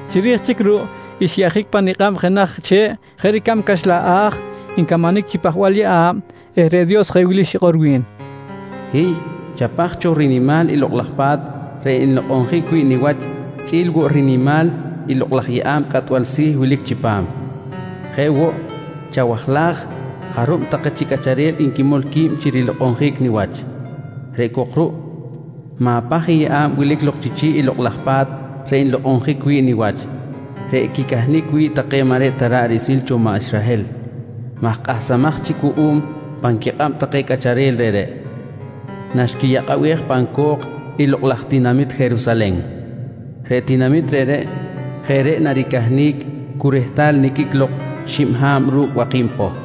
Chiri̱j chic ruꞌ xyeꞌjic pa nikꞌab jenaj che̱ꞌ jeꞌ ricab caxlan a̱j ncamanic chi pajbal yeꞌa̱b eh reꞌ Dios jeꞌ wili xikꞌor wi̱n: «Hiy, chapaj cho rinimal i Lokꞌ laj Pa̱t reꞌ nlokꞌonjic wi̱ꞌ niwach chꞌi̱l woꞌ rinimal i lokꞌ laj yeꞌa̱b cꞌatbal si̱ wilic chipam. Jeꞌ woꞌ, chawajlaj jarub take chi cꞌacharel nquimol qui̱b chi rilokꞌonjic niwach. Reꞌ cok ruꞌ, ma̱paj i yeꞌa̱b wilic lok chi chi̱ꞌ i Lokꞌ laj Pa̱t reꞌ nlokꞌonjic wi̱ꞌ niwach, reꞌ quicahnic wi̱ꞌ take maꞌ reꞌ ta ra̱ꞌ riꞌsil cho maꞌ Israhel maj kꞌahsamaj chic wuꞌum pan quikꞌab take cꞌacharel reꞌreꞌ naxquiyakꞌabej pan co̱k i lokꞌ laj tinamit Jerusalen. Reꞌ tinamit reꞌreꞌ jeꞌ reꞌ naricahnic cu rehtal niqꞌuic lok xib ha̱b ru̱cꞌ waki̱b poh.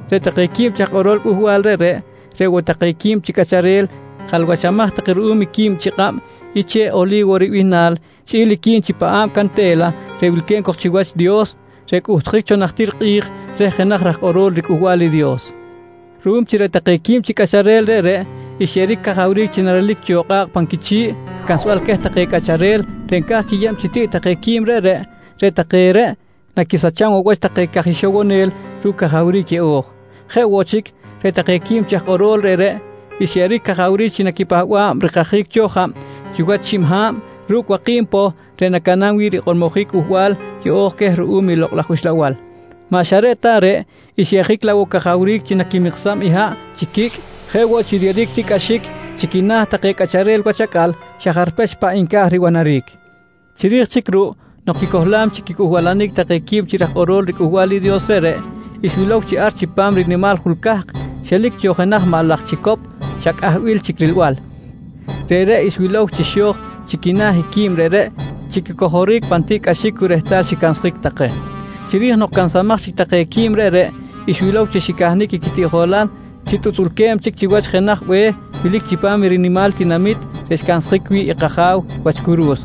Reꞌ take quib chi aj kꞌorol cꞌuhbal reꞌreꞌ, reꞌ woꞌ take quib chi cꞌacharel jalwachamaj take ruꞌum i quib chi kꞌab i che̱ꞌ “Oli̱wo” ribihnal chꞌi̱l i quib chi paꞌa̱b cante̱la reꞌ wilque̱b cok chiwach Dios reꞌ cꞌuhtjic cho najtir kꞌi̱j reh jenaj raj kꞌorol riCꞌuhbal i Dios. Ruꞌum chi reꞌ take quib chi cꞌacharel reꞌreꞌ xyeꞌeric cajawric chi narelic cho kꞌa̱kꞌ pan quichi̱ꞌ cansbal queh take cꞌacharel reꞌ nca̱j quiyeb chi tiꞌ take quib reꞌreꞌ, reꞌ take reꞌ naquisacham woꞌ wach take caj ixowonel ru̱cꞌ cajawric yeꞌo̱j. Jeꞌ woꞌ chic, reꞌ take quib chi aj kꞌoro̱l reꞌreꞌ xyeꞌeric cajawric chi naquipahba̱b rikajic cho jab chiwach xib ha̱b ru̱cꞌ waki̱b poh reꞌ nacaꞌnam wi̱ꞌ rikꞌormojic i cꞌuhbal yeꞌo̱j queh ruꞌum i Lokꞌ laj Uxlabal. Maꞌ xa reꞌ ta reꞌ, xyeꞌjic laꞌ woꞌ cajawric chi naquimiksam i haꞌ chi quicꞌ, jeꞌ woꞌ chi riyeꞌeric tiꞌcꞌaxic chi quina̱ take cꞌacharel wach acꞌal xa jarpech paꞌ nca̱j ribanaric. Chiri̱j ruꞌ nok quicohlam chic wach quicꞌuhbalanic take quib chi raj kꞌorol riCꞌuhbal i Dios reꞌreꞌ, xwilow chi ar chipam i rinimal jul cahk xelic cho jenaj maꞌ laj chicop xa cꞌahbil chic rilbal. Reꞌreꞌ xwilow chi xo̱j chi quina̱ i quib reꞌreꞌ chi quicojoric pan tiꞌ cꞌaxic cu rehtal xicansaj take. Chiri̱j nok cansamaj chic take qui̱b reꞌreꞌ, xwilow chi xcahnic i quitiꞌjolal chi tutzꞌulque̱b chic chiwach jenaj be̱h wilic chipam i rinimal tinamit reꞌ xcansjic wi̱ꞌ i kAja̱w wach curu̱s.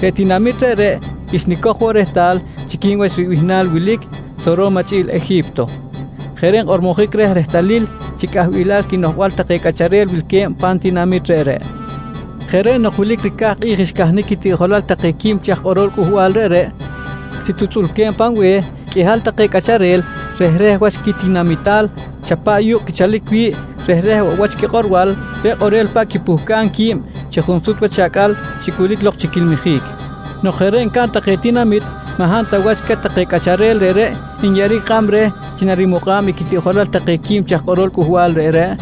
Reꞌ tinamit reꞌreꞌ, xnicoj woꞌ rehtal chi quib wach ribihnal wilic, “Soro̱ma” chꞌi̱l “Eji̱pto”. Jeꞌ reꞌ nkꞌormojic reh rehtalil chi cꞌahbil quinoꞌjbal take cꞌacharel wilque̱b pan tinamit reꞌreꞌ. Jeꞌ reꞌ nok wilic ricaj kꞌi̱j xcahnic quitiꞌjolal take quib chi aj kꞌorol cꞌuhbal reꞌreꞌ chi tutzꞌulque̱b pan be̱h, qꞌuihal take cꞌacharel rehreh wach quitinamital xa paꞌ yukꞌul quichalic wi̱ꞌ, rehreh woꞌ wach quikꞌorbal reꞌ kꞌorel paꞌ quipuhcam qui̱b chi junsut wach acꞌal xicꞌulic lok chi quilmijic. Nok jeꞌ reꞌ ncaꞌn take tinamit, maꞌ hab ta wach queh take cꞌacharel reꞌreꞌ nyeꞌeric kꞌab reh chi narimukꞌa̱b i quitiꞌjolal take quib chi aj kꞌorol cꞌuhbal reꞌreꞌ,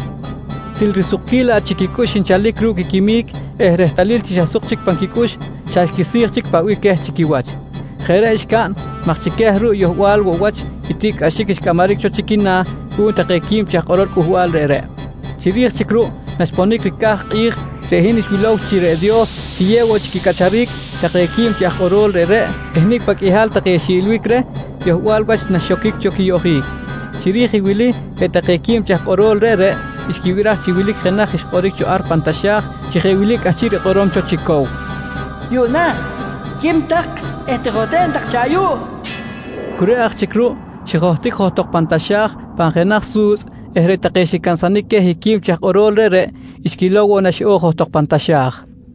til risukquil laꞌ chic quicꞌux nchalic ru̱cꞌ quiquimic eh rehtalil chi xa suk chic pan quicꞌux, xa xquisi̱j chic paꞌ bih queh chi quiwach. Jeꞌ reꞌ xcaꞌn maj chi queh ruꞌ yohbal woꞌ wach i tiꞌcꞌaxic xcꞌamaric cho chi quina̱ cuꞌum take quib chi aj kꞌorol cꞌuhbal reꞌreꞌ. Chiri̱j ruꞌ naxponic ricaj kꞌi̱j reꞌ hin xwilow chi reꞌ Dios xiyew woꞌ chic quicꞌacharic take quib chi aj kꞌorol reꞌreꞌ eh nicꞌ paꞌ qꞌuihal take xiꞌilbic reh yohbal wach naxoquic quiyoꞌjic. Chiri̱j i wili reꞌ take quib chi aj kꞌorol reꞌreꞌ xquibiraj chi wilic jenaj xkꞌoric cho ar pan taxa̱j chi jeꞌ wili cꞌahchiꞌ rikꞌorom cho chi cow: «Yuꞌna quim tak eh tijohten tak cho ayuꞌ, nqui banol cho queh. Cu reꞌ aj chic ruꞌ xijohtic johtok pan taxa̱j pan jenaj su̱tzꞌ eh reꞌ take xicansanic queh i quib chi aj kꞌoro̱l reꞌreꞌ xquilow woꞌ na xiꞌo̱j johtok pan taxa̱j.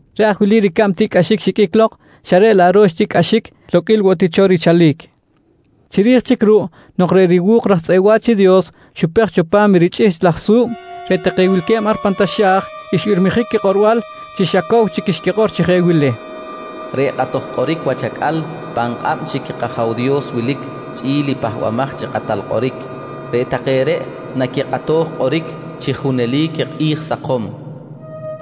Reꞌ aj wili ricab tiꞌcꞌaxic xiqꞌuic lok xa reꞌ laꞌ ro̱x tiꞌcꞌaxic loqꞌuil woꞌ ti cho richalic. Chiri̱j chic ruꞌ nok reꞌ riwu̱k raj tzꞌeꞌ wa̱ch i Dios xupej cho pa̱m i richꞌihchꞌ laj su̱b, reꞌ take wilque̱b ar pan taxa̱j xbirmijic quikꞌorbal chi xa cow chic xquikꞌor chi jeꞌ wili: “Reꞌ kꞌatoj kꞌoric wach acꞌal pan kꞌab chic i kAja̱w Dios wilic chꞌi̱l i Pahbamaj chi Kꞌatal Kꞌoric. Reꞌ take reꞌ naquikꞌatoj kꞌoric chi junelic i kꞌi̱j sakom, nqui xbirmijic.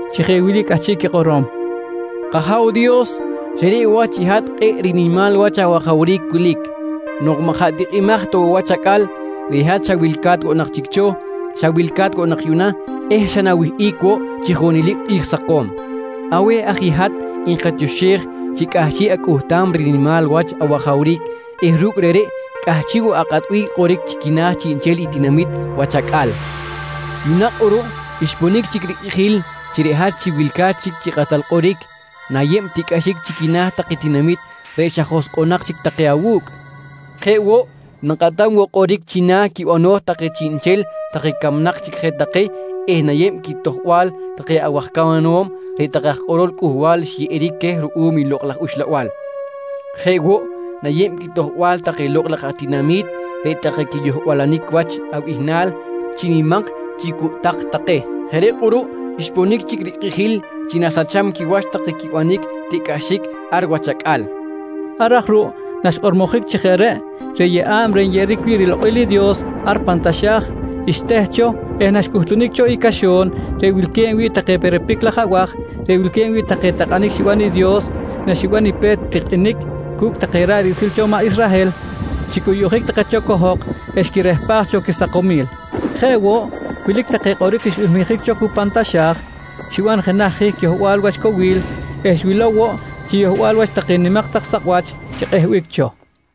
chi jeꞌ wili i cꞌahchiꞌ quikꞌorom: “K-Aja̱w Dios, xa reꞌ wach i hat kꞌe̱ꞌ rinimal wach awajawric wilic. Nok maꞌ jaꞌ tikꞌimaj ta woꞌ wach acꞌal reꞌ hat xa wilca̱t woꞌ nak chic cho, xa wilca̱t woꞌ yuꞌna eh xa na̱wihꞌic woꞌ chi junelic kꞌi̱j sakom. Aweh aj i hat nkatioxej chi cꞌahchiꞌ acꞌuhtam rinimal wach awajawric eh ru̱cꞌ reꞌreꞌ cꞌahchiꞌ woꞌ akꞌatbic kꞌoric chi quina̱ chiꞌnchel i tinamit wach acꞌal. Yuꞌna kꞌuruꞌ xponic chic i rikꞌijil chi reꞌ hat chi wilca̱t chic chi kꞌatal kꞌoric, na̱yeb tiꞌcꞌaxic chi quina̱ take tinamit reꞌ xa joskꞌonak chic take awu̱cꞌ. Jeꞌ woꞌ na̱kꞌatam woꞌ kꞌoric china̱ quibano̱j take chiꞌnchel take camnak chic je take eh na̱yeb quitojbal take awaj camanom reꞌ take aj kꞌorol cꞌuhbal xyeꞌeric queh ruꞌum i Lokꞌ laj Uxlabal. Jeꞌ woꞌ, na̱yeb quitojbal take lokꞌ laj atinami̱t reꞌ take quiyohbalanic wach abihnal chi nimak chi cucꞌtak take. Jeꞌ reꞌ kꞌuruꞌ xponic chic rikꞌijil chi na̱sacham quiwach take quibanic tiꞌcꞌaxic ar wach acꞌal, nqui take. Ar aj ruꞌ naxkꞌormojic chi jeꞌ reꞌ, reꞌ yeꞌa̱b reꞌ nyeꞌeric wi̱ꞌ rilokꞌil i Dios ar pan taxa̱j xteh cho eh naxcꞌuhtunic cho i caxo̱n reꞌ wilque̱b wi̱ꞌ take perepic laj abaj reꞌ wilque̱b wi̱ꞌ take takꞌanic xiban i Dios naxiban i pe̱t tikꞌinic cu̱cꞌ take ra̱ꞌ riꞌsil cho i maꞌ Israhel, xicꞌuyuꞌjic take cho cohok eh xquirehpaj cho quisakomil. Jeꞌ woꞌ, wilic take kꞌoric xbirmijic cho cu pan taxa̱j, xiban jenaj hihc yohbal wach cowil eh xwilow woꞌ chi yohbal wach take nimak tak sakꞌwach xikꞌehbic cho.